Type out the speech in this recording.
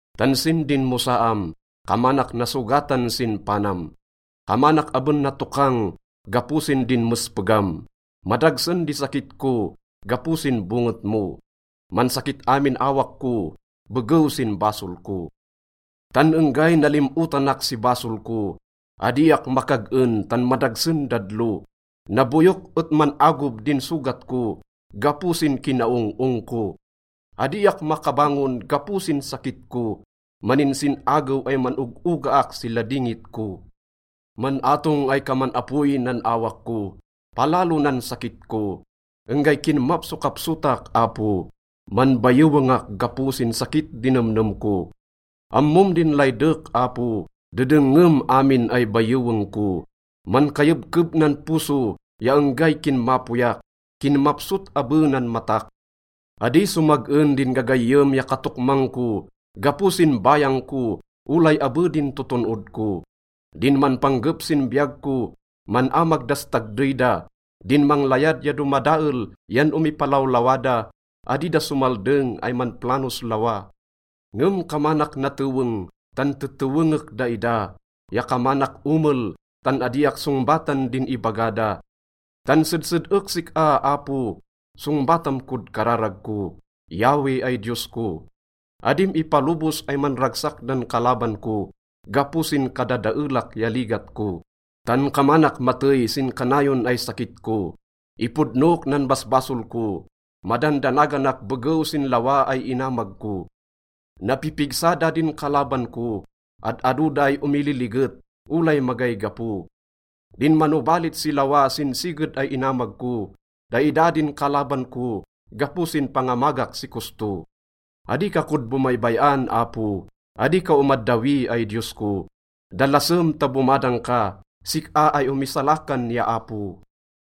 Tan sin dinmosaam, kamanak nasogatan sin panam, kamanak aben natokang gapo sin dinmespegam. Madagsen di sakit ko gapo sin bonget mo, mansakit amin awak ko begew sin basol ko. Tan enggay nalim-otanak si basol ko, adiak makag-en tan madagsen dadlo. Naboyok et man-agob din sogat ko gapo sin kinaong-ong ko. Adiak makabangon gapo sin sakit ko. Maninsin-agew ay man-og-ogaak si ladingit ko. Man-atong ay kaman apoy nan awak ko, palalo nan sakit ko. Enggay kinmapsokapsotak, Apo, manbayewengak gapo sin sakit di nemnem ko. Ammom din laydek, Apo, dedengngem amin ay bayeweng ko. Mankayebkeb nan poso ya enggay kinmapoyak, kinmapsot abe nan matak. Adi somag-en din gagayyem ya katokmang ko gapo sin bayang ko, olay abe din toton-od ko. Din manpanggep sin biyag ko, man-amag das tagdey da, din manglayad ay domadael yan omipalawlawa da, adi da somaldeng ay manplanos lawa. Ngem kamanak nateweng, tan tetewengek daida, ya kamanak omel, tan adiak songbatan din ibaga da. Tan sedsed-ek sik-a, Apo, songbatam kod kararag ko, Yahweh ay Diyos ko. Adim ipalobos ay manragsak dan kalaban ko gapo sin kadadaelak ya ligat ko, tan kamanak matey sin kanayon ay sakit ko. Ipodnok nan basbasol ko madandanaganak begew sin lawa ay inamag ko. Napipigsa da din kalaban ko, ad-ado da ay omililiget, olay magay gapo. Din manobalit si lawa sin siged ay inamag ko, daida din kalaban ko gapo sin pangamagak si kosto. Adi ka kod bomaybay-an, Apo, adi ka omaddawi ay Diyos ko. Dalasem ta bomadang ka, sik-a ay omisalakan ya Apo.